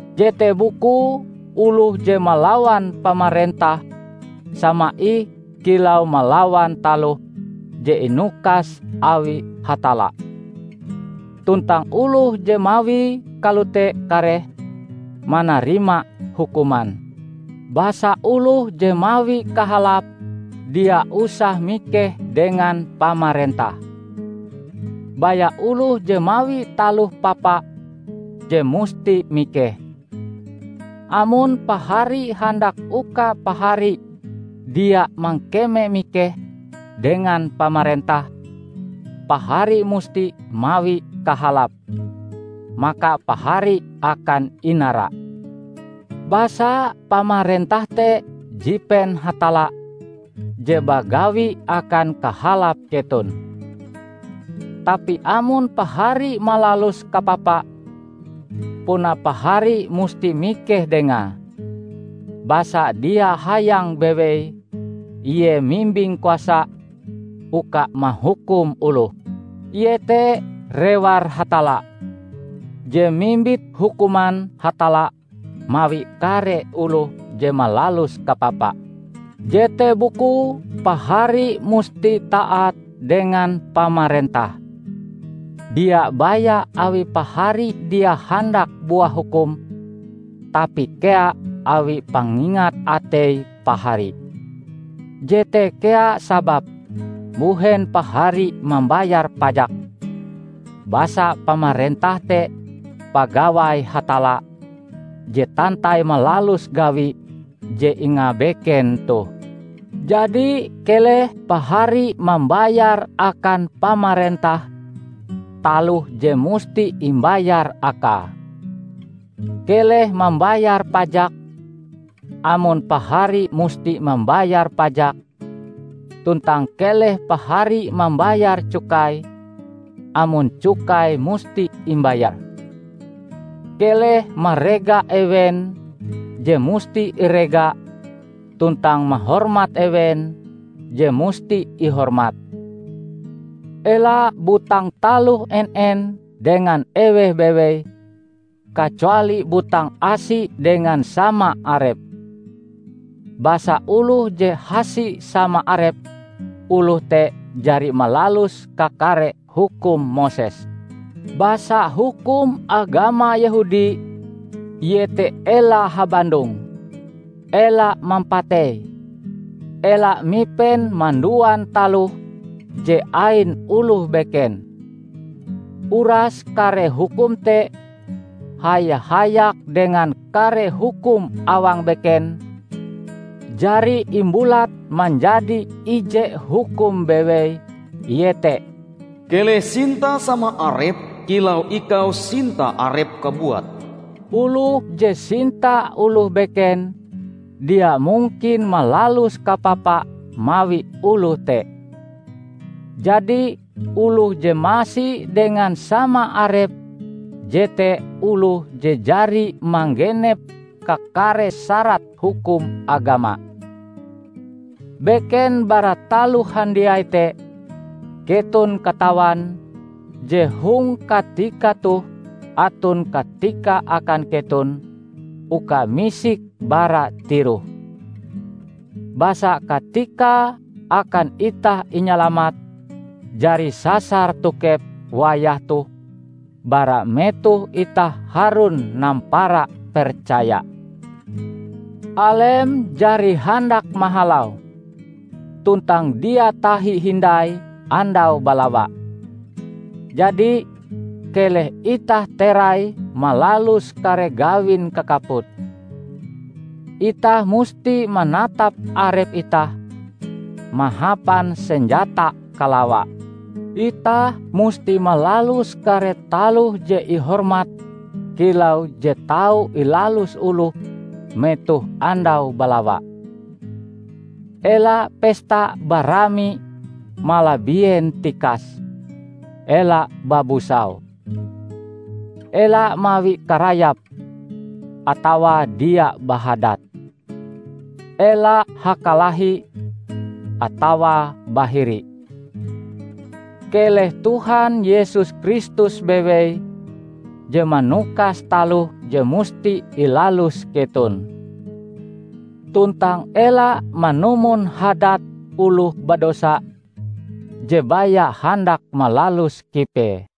Jete bukue oloh je malawan pamarentah sama ih kilau malawan taloh je inukas awi Hatalla. Tuntang oloh je mawie kalote kareh manarima hukuman. Basa oloh je mawi kahalap, dia usah mikeh dengan pamarentah. Baya oloh je mawi taloh papa je musti mikeh. Amon pahari handak uka pahari dia mangkeme mikeh dengan pamarentah, pahari musti mawi kahalap, maka pahari akan inara. Basa pamarentah te jipen Hatalla je bagawi akan kahalap keton. Tapi amon pahari malalus kapapa, puna pahari musti mikeh dengae, basa dia hayang bewei ie mimbing kuasa uka mahukum oloh. Ie te rewar Hatalla, je mimbit hukuman Hatalla mawi kare oloh je malalus kapapa. Jete bukue pahari musti taat dengan pamarentah -- dia baya awi pahari dia handak buah hukum, tapi kea awi pangingat atei pahari. Jete kea sababe mbuhen pahari mambayar pajak, basa pamarentah te pagawai Hatalla je tantai malalus gawi je ingabeken toh. Jadi keleh pahari mambayar akan pamarentah taloh je musti imbayar akae. Keleh mambayar pajak, amon pahari musti mambayar pajak; tuntang keleh pahari mambayar cukai amon cukai musti imbayar. Keleh marega ewen je musti irega tuntang mahormat ewen je musti ihormat. Ela butang taloh en-en dengan eweh bewei, kacuali butang asi dengan sama arep. Basa oloh je hasi sama arepe, oloh te jari malalus kakare hukum Moses. Basa hukum agama Yehudi, iete ela habandong, ela mampatei, ela mipen manduan taloh je ain oloh beken; uras kare hukum te haya-hayak dengan kare hukum awang beken, jari imbulat manjadi ije hukum bewei, iete, "Keleh sinta sama arepm kilau ikau sinta arepm kabuat." Oloh je sinta oloh beken, dia mungkin malalus kapapa mawi oloh te. Jadi oloh je masi dengan sama arepe jete oloh je jari manggenep kakare syarat hukum agama. Beken bara taloh handiai te keton katawan je hong katika toh aton katika akan keton uka misik bara tiroh. Basa katikae akan itah inyalamat jari sasar tokep wayah toh bara metoh itah harun nampara percaya. Alem jari handak mahalau; tuntang dia tahi hindai andau balawa. Jadi, keleh itah terai malalus kare gawin kakaput. Itah musti manatap arep itah mahapan senjata kalawa. Itah musti malalus kare taloh je ihormat kilau je tau ilalus oloh metoh andau balawa; ela pesta barami malabien tikase, ela babusau. Ela mawi karayap, atawa dia bahadat. Ela hakalahi, atawa bahiri. Keleh Tuhan Yesus Kristus bewei je manukas taloh je musti ilalus keton. Tuntang ela manumon hadat oloh badosa je baya handak malalus kipee.